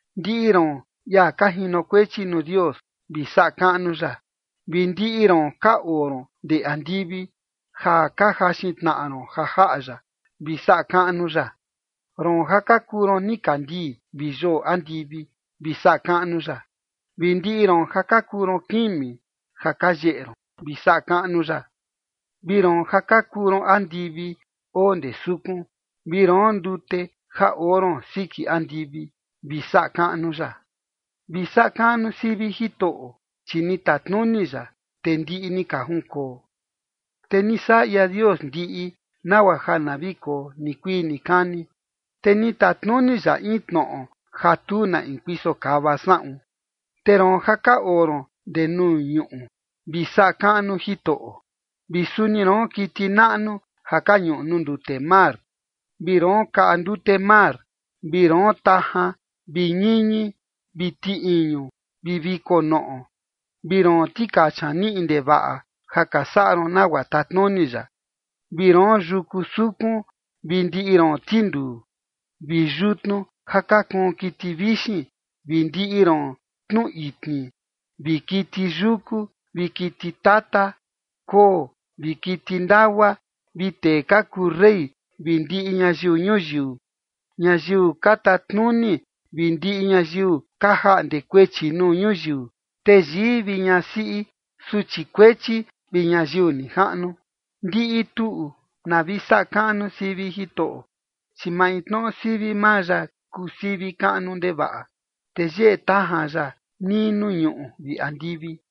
Ndiꞌi roon, ia ka jinokuechi nuu Dios, vi saꞌa kaꞌnu ya, vi ndiꞌi roon ka oo ron ndee andivi ja ka jaxin tnaꞌa ron ja jaꞌa ya, vi saꞌa kaꞌnu ya. Roon ja ka kuu ron nikandii vi yoo andivi, vi saꞌa kaꞌnu ya, vi ndiꞌi roon ja ka kuu ron kimi ja ka yeꞌe ron, vi saꞌa kaꞌnu ya. Vi roon ja ka kuu ron andivi oo ndee sukun, vi roon ndute, ja oo ron siki andivi, vi saꞌa kaꞌnu ya. Vi saꞌa kaꞌnu sivi Jitoꞌo, chi ni tatnuni ya, te ndiꞌi ni ka junkoo. Te ni saꞌa ia Dios ndiꞌi, nagua ja na vi koo nikuii nikani. Te ni tatnuni ya in tnoꞌo ja tu na in kuiso kava saꞌun. Te roon ja ka oo ron ndee nuu ñuꞌu, vi saꞌa kaꞌnu Jitoꞌo, vi suni roon, kiti naꞌnu ja ka ñuꞌu nuu ndute mar, vi roon kaꞌa ndute mar, vi roon, tajan vi ñiñi vi ti iñu vi viko noꞌo, vi roon, tikacha niꞌi ndevaꞌa, ja ka saꞌa ron nagua tatnuni ya, vi roon, yuku sukun vi ndiꞌi roon tinduu, vi yutnu ja ka kuun kiti vixin vi ndiꞌi roon tnu itni, vi kiti yuku vi kiti tata, koo, vi kiti ndagua, vi tee ka kuu rey vi ndiꞌi ñayiu ñuyiu, ñayiu ka tatnuni vi ndiꞌi ñayiu ka jaꞌnde kuechi nuu ñuyiu, teyii vi ñasiꞌi, suchi kuechi vi ñayiu nijaꞌnu, ndiꞌi tuꞌu na vi saꞌa kaꞌnu sivi Jitoꞌo, chi maintnoꞌo sivi maa ya kuu sivi kaꞌnu ndevaꞌa, te yeꞌe tajan ya nii nuu ñuꞌu vi andivi.